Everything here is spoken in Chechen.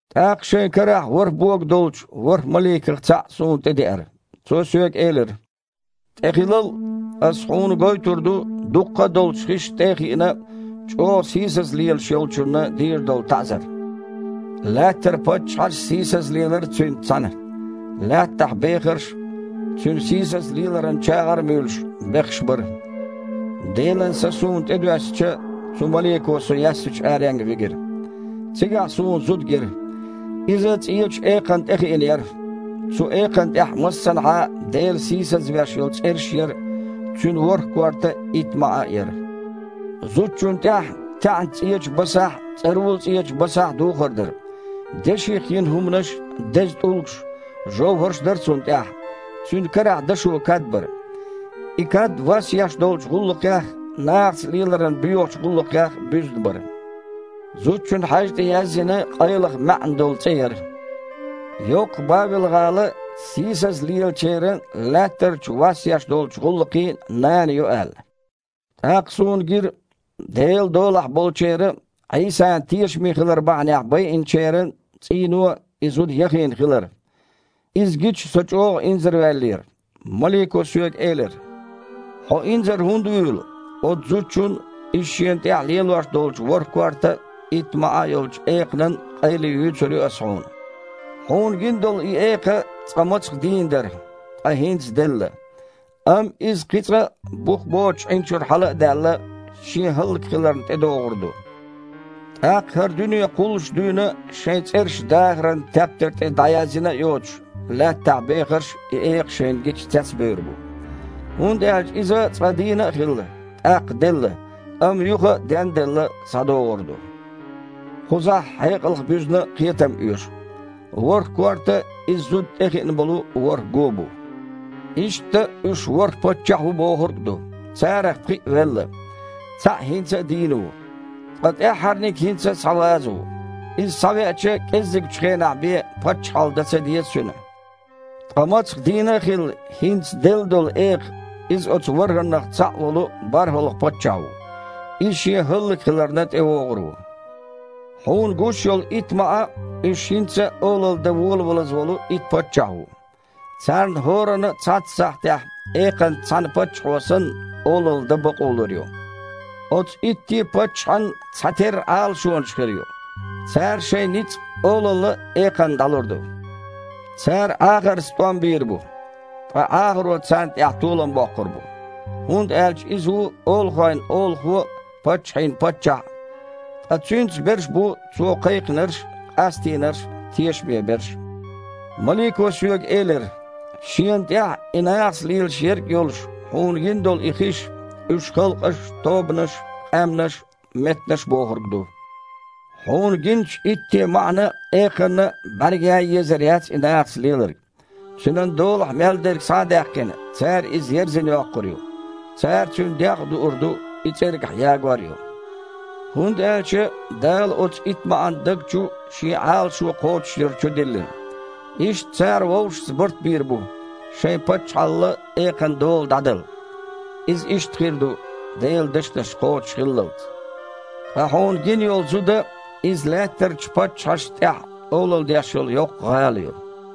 ТІаккха шайн карахь ворхІ бога долчу ворхІ маликах цхьаъ суна тІедеара. Цо соьга элира: «ТІехилал! Ас хьуна гойтур ду, дуккха а долчу хишна тІе а хиъна, чІогІа сийсаза лелаш йолчунна дийр долу таІзар. Лаьттара паччахьаш а сийсаза лелара цуьнца цхьаьна. Лаьттахь бехарш а, цуьнан сийсаза леларан чагІар а муьйлуш, бехаш бара». Делан Са суна тІе доьссича, цу малико со яьссачу аренга вигира. Цигахь суна зуда гира. Иза цІечу экханна тІехиъна яра. Цу экханна тІехь массанхьа а Дела сийсазвеш йолу цІераш а яра, цуьнан ворхІ корта а, итт маІа а яра. Зудчунна тІехь таьІна цІечу басахь а, цІарула-цІечу басахь а духар дара. Деших йина хІуманаш, деза тІулгаш, жовхІарш дара цунна тІехь. Цуьнан карахь дашо кад бара. И кад вас еш долчу гІуллакхех а, нахаца леларан боьхачу гІуллакхех а буьзна бара. Зудчун хьаьжа тІе язйина къайлаха маьІна долу цІе яра: «Йоккха Бавел-гІала сийсаза лелачеран а, лаьттарчу вас еш долчу гІуллакхийн а нана ю», – аьлла. ТІаккха суна гира Делан долахь болчеран а, Іийсана тешаме хилар бахьанехь байинчеран а цІийно и зуда яхийна хилар. Иза гича, со чІогІа инзарваьллера. Малико соьга элира: «Хьо инзар хІунда вуьйлу? Оцу зудчун а, иза шена тІехь лелош долчу ворхІ корта а, итт маІа а йолчу экханан а къайле юьйцур ю ас хьуна. Хьуна гина долу и экха цкъа мацах дийна дара, ткъа хІинца делла. Амма иза кхин цкъа а, бух боцучу Іин чуьра хьала а даьлла, шен хІаллакьхиларна тІедогІур ду. ТІаккха, хІара дуьне кхуллуш дуьйна а шайн цІераш дахаран тептар тІе дІаязйина а йоцуш, лаьттахь бехарш, и экха шайна гича, цецбевр бу. ХІунда аьлча иза цкъа дийна а хилла, тІаккха делла, амма юха, ден а делла, схьадогІур ду. Кхузахь хьекъалх буьзна кхетам оьшу. ВорхІ корта – иза зуда тІехиъна болу ворхІ гу бу. Иштта уьш ворхІ паччахь ву бохург а ду. Царах пхиъ велла. Цхьаъ хІинца а дийна ву. Ткъа тІаьххьарниг хІинца а схьаваза ву. Иза схьавеача, кІезигчу хенахь бен паччахьалла дан ца деза цуьнан. Ткъа мацах дийна а хилла, хІинца делла долу экха – иза оцу ворхІаннах цхьаъ волу борхІалгІа паччахь ву. Иза шен хІаллакьхиларна тІевогІур ву. Хьуна гуш йолу итт маІа – уьш хІинца а олалла дан волавалаза волу итт паччахь ву. Царна хІоранна а цхьацца сахьтехь экханца цхьаьна, паччахьо санна, олалла дан бакъо лур ю. Оцу итте а паччахьан цхьатерра Іалашонаш хир ю. Цара шайн ницкъ а, олалла а экханна дІалур ду. Цара Іахарца тІом бийр бу. Ткъа Іахаро царна тІехь толам боккхур бу, хІунда аьлча Иза ву олахойн Олахо а, паччахьийн Паччахь а. Ткъа Цуьнца берш бу Цо кхайкхинарш а, къастийнарш а, тешаме берш а». Малико соьга элира: «Шена тІехь и нахаца лелаш ерг а йолуш, хьуна гина долу и хиш – уьш халкъаш а, тобанаш а, къаьмнаш а, меттанаш а бохург ду. Хьуна гиначу итте а маІана а, экханна а бІаьрга ян а езар яц и нахаца леларг. Цуьнан долахь мел дерг схьа а даьккхина, цара иза ерзина йоккхур ю. Цара цуьнан дегІ а дуур ду, и цІергахь ягор а ю. ХІунда аьлча Дала оцу итт маІан даг чу Шен Іалашо кхочушъяр чудиллина. Иштта цара вовшашца барт бийр бу шайн паччахьалла экханан дола дІадала. Иза иштта хир ду, Делан дешнаш кхочушхиллалц. Ткъа хьуна гина йолу зуда – иза лаьттарчу паччахьашна тІехь олалла деш йолу йоккха гІала ю».